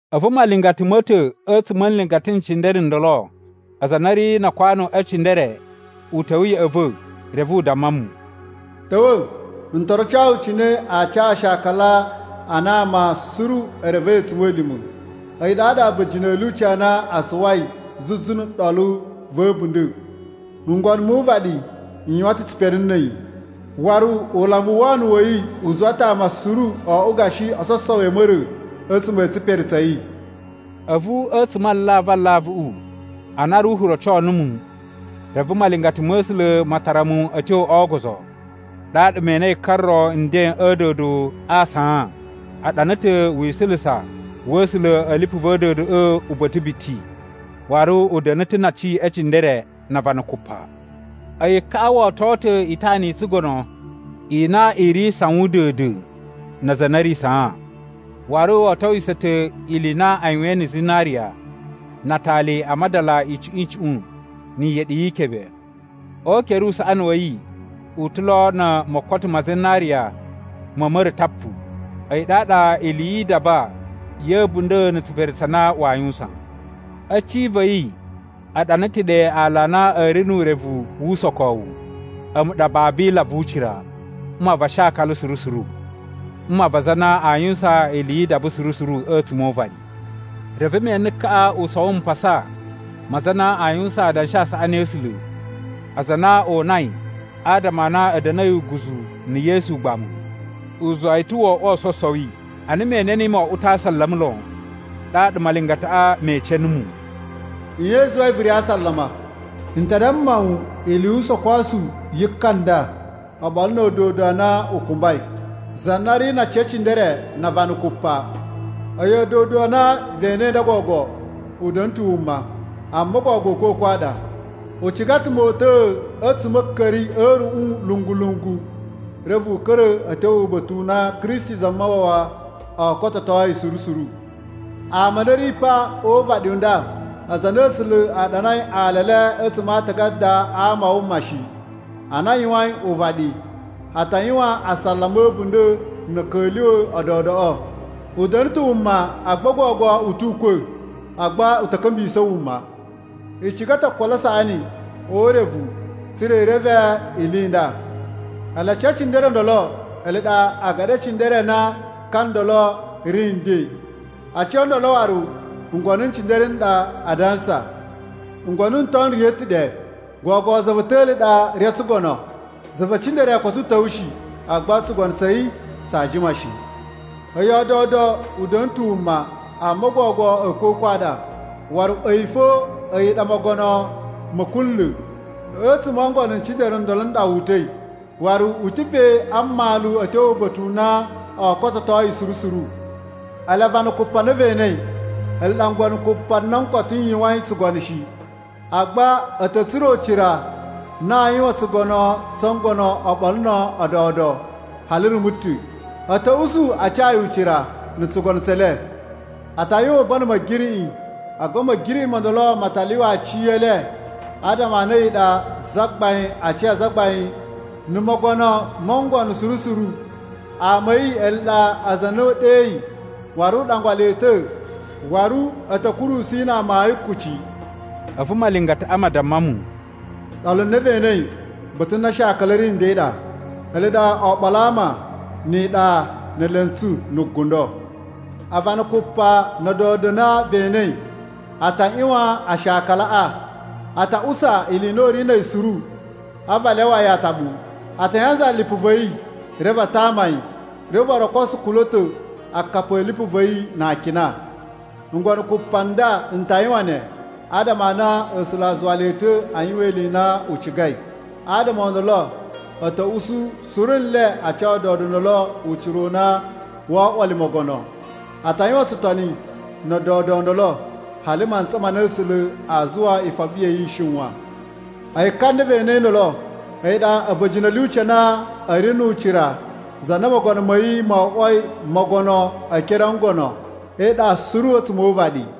A̱vu malingata ma̱ ta̱ a̱tsuma̱ a nlingata n cindere n ndolo aza a na a̱ ri na akwanu e cindere u ta̱wa̱ ya̱ꞌa̱ va̱ reve u damma mu, “Ta̱wa̱, n to roco wu cine aa ca aashakala a na ama suru e revei a̱tsuma̱lima̱, a̱yi ɗaɗa a̱ba̱jini a̱ lyuci a na a suwai zuzu na̱ ɗolu va̱ a̱bunda̱. Ngono mu uvaɗi n yuwan ta̱ tsipere na̱ a̱yi, waru ulambu u wono wa̱ yi u zuwa ta̱ ama suru o oꞌwo gashi ososowi a̱ ma̱ra̱ a̱tsuma̱ a̱ tsipere tsa̱ yi.” A̱vu a̱tsuma̱ a alavu alavuꞌu a na Ruhu roco numu, reve malingata ma̱ A̱sula̱ ma tara mu a̱ tyo o ogozo. Ɗaɗa me enei ka ro nden a̱ a̱a̱dodo a saan. A ɗana ta̱ wisulusa wa̱ A̱sula̱ a̱ lipu va̱ a̱a̱dodoꞌo uba̱ta̱ biti, waru u da̱na̱ ta̱ na aci e cindere na avana kupa. A̱yi kaꞌa wo oto ta̱ itana i tsugono i na i ri sawun da̱a̱n-da̱a̱n na aza a na a̱ ri saan. Waru wo otowiso ta̱ ili i na a yuwain na̱ zinariya, na atali a madala icuꞌun icuꞌun ni iyeɗi yi ikebe. O ukere usaꞌani wa̱ yi u ta̱ lo na̱ mokoto ma zinariya ma̱ ma̱ra̱ tapu, a̱yi ɗaɗa ili yi idaba ya̱ a̱bunda̱ na̱ tsipere tsa na waa yuwusan. A̱ cin va̱ yi a ɗana ta̱ ɗe aala a na a̱ ri nu urevu wu usokowu, “A̱mu ɗa Babila vu ucira, mma va ashakala suru suru, mma va aza a na a yuwusan ili yi idaba suru suru a̱tsuma̱ o uvaɗi.” Reve me ene kaꞌa u sowo mpasa ma aza a na a yuwusan adanshi a saꞌani a̱ A̱sula̱, aza a na o unai adama a na a̱ da̱na̱i uguzu na̱ Yesu ugbamu. U zuwa yi ta̱ wo oꞌwo ososowi. Ana me ene niyi mo oꞌwo ta̱ a asalama lon. Ɗaɗa malingataꞌa me ece numu, “Nye i zuwai vu ri a asalama? N ta damma wu ili yu usokosu yi ka nda oɓolo na̱ a̱a̱dodo a na u kumbai, za na ri na aci e cindere na avana kupa. A̱yi a̱a̱dodo a na ve enei nda gogo u da̱na̱ ta̱ wuma, amma gogo a̱a̱kwa̱kwa̱ a ɗa. U ciga ta̱ mota̱a̱ a̱tsuma̱ a̱ a̱a̱ka̱ri a̱ a̱ruꞌun lungu-lungu, reve u ka̱ra̱ a̱ tyo uba̱ta̱ u na Kristi Zamawawa oo kototo yi suru suru. Ama a na a̱ ri pa o uvaɗi u nda, aza a na A̱sula̱ a ɗanai ala e le a̱tsuma̱ a aatagada a ama a wuma shi ana a yuwain uvaɗi, a ta yuwan asalama a̱bunda̱ na̱ a̱ ka̱lyuwa̱ a̱a̱dodoꞌo. U da̱na̱ ta̱ wuma, agba gogo u tu ukwa̱, agba u ta̱ ka̱mbisa̱ wuma. “I ciga ta̱ okolo a saꞌani o urevu tsa̱ra̱ i reve ili i nda. Ele aci e cindere o ndolo ele ɗa agaɗi e cindere a na ka ndolo ri nden. Aci o ndolo waru ngono n cindere n ɗa a dansa. Ngono n ton n riya̱ ta̱ ɗe, gogo za va̱ ta̱li ɗa ri o tsugono, za ve cindere koto u ta̱wa̱ shi, agba tsugono tsa̱ yi tsaa jima shi. A̱yi a̱a̱dodo u da̱na̱ ta̱ wuma, amma gogo a̱a̱kwa̱kwa̱ a ɗa, waru a̱yi fo a̱yi ɗa mogono ma̱ kunla̱. A̱tsuma̱ o ngono n cindere n ndolo n ɗa wu uta̱i, waru u ta̱ pe a mmalu a̱ tyo uba̱ta̱ u na oo kototo yi suru suru. “Ele avana kupa a na ve enei, ele ɗa ngono kupa n na koto a yuwain tsugono shi, agba a̱ ta̱ tsura̱ ucira u na aa yuwan tsugono tsu ngono oɓolo na̱ a̱a̱dodo hali rumu ta̱. A̱ ta̱ usu a ca yi ucira na̱ tsugono tse le. A ta yuwan uvon na̱ Ma̱giriꞌi, agba Ma̱giriꞌi mo ndolo ma ta lyuwa aci e le adama a na a̱yi ɗa Zagbain a aci a azagbain na̱ Mogono mo ngono suru suru. Ama a̱ yi ele ɗa aza a na u ɗeyi waru u ɗangwa le ta̱ waru a̱ ta̱ kurusu yi na amayun kuci.” A̱vu malingataꞌa ma damma mu, “Ɗolu na ve enei, ba̱ta̱ na aashakala a̱ ri nden ɗa, ele ɗa oɓolo a ama, ni iɗa, ne elentsu, na̱ gundo. Avana kupa na̱ a̱a̱dodo a na ve enei a ta ꞌyuwan aashakalaꞌa. A ta usa ili i na u ri na̱ a̱yi suru a̱vu a lyawa yi ataɓu. A ta yanzala lipu va̱ yi reve a tama yi, reve waru o koso kula̱to akapi a̱ lipu va̱ yi na akina. Ngono kupa nda n ta yuwan ne adama a na A̱sula̱ a zuwa le ta̱ a yuwan ili i na u cigai. Adama o ndolo a̱ ta̱ usu suru nle a ca a̱a̱dodo o ndolo ucira u na woo oꞌwo le mogono. A ta yuwan tsutoni na̱ a̱a̱dodo o ndolo hali mantsa ma na A̱sula̱ a zuwa ifoɓi ya̱ yi i shiwan. A̱yi ka na ve enei ndolo a̱yi ɗa a̱ba̱jini a̱ lyuci a na a̱ ri nu ucira za na mogono ma̱ yi mo oꞌwoi mogono e ekere o ngono e iɗa suru a̱tsuma̱ o uvaɗi.”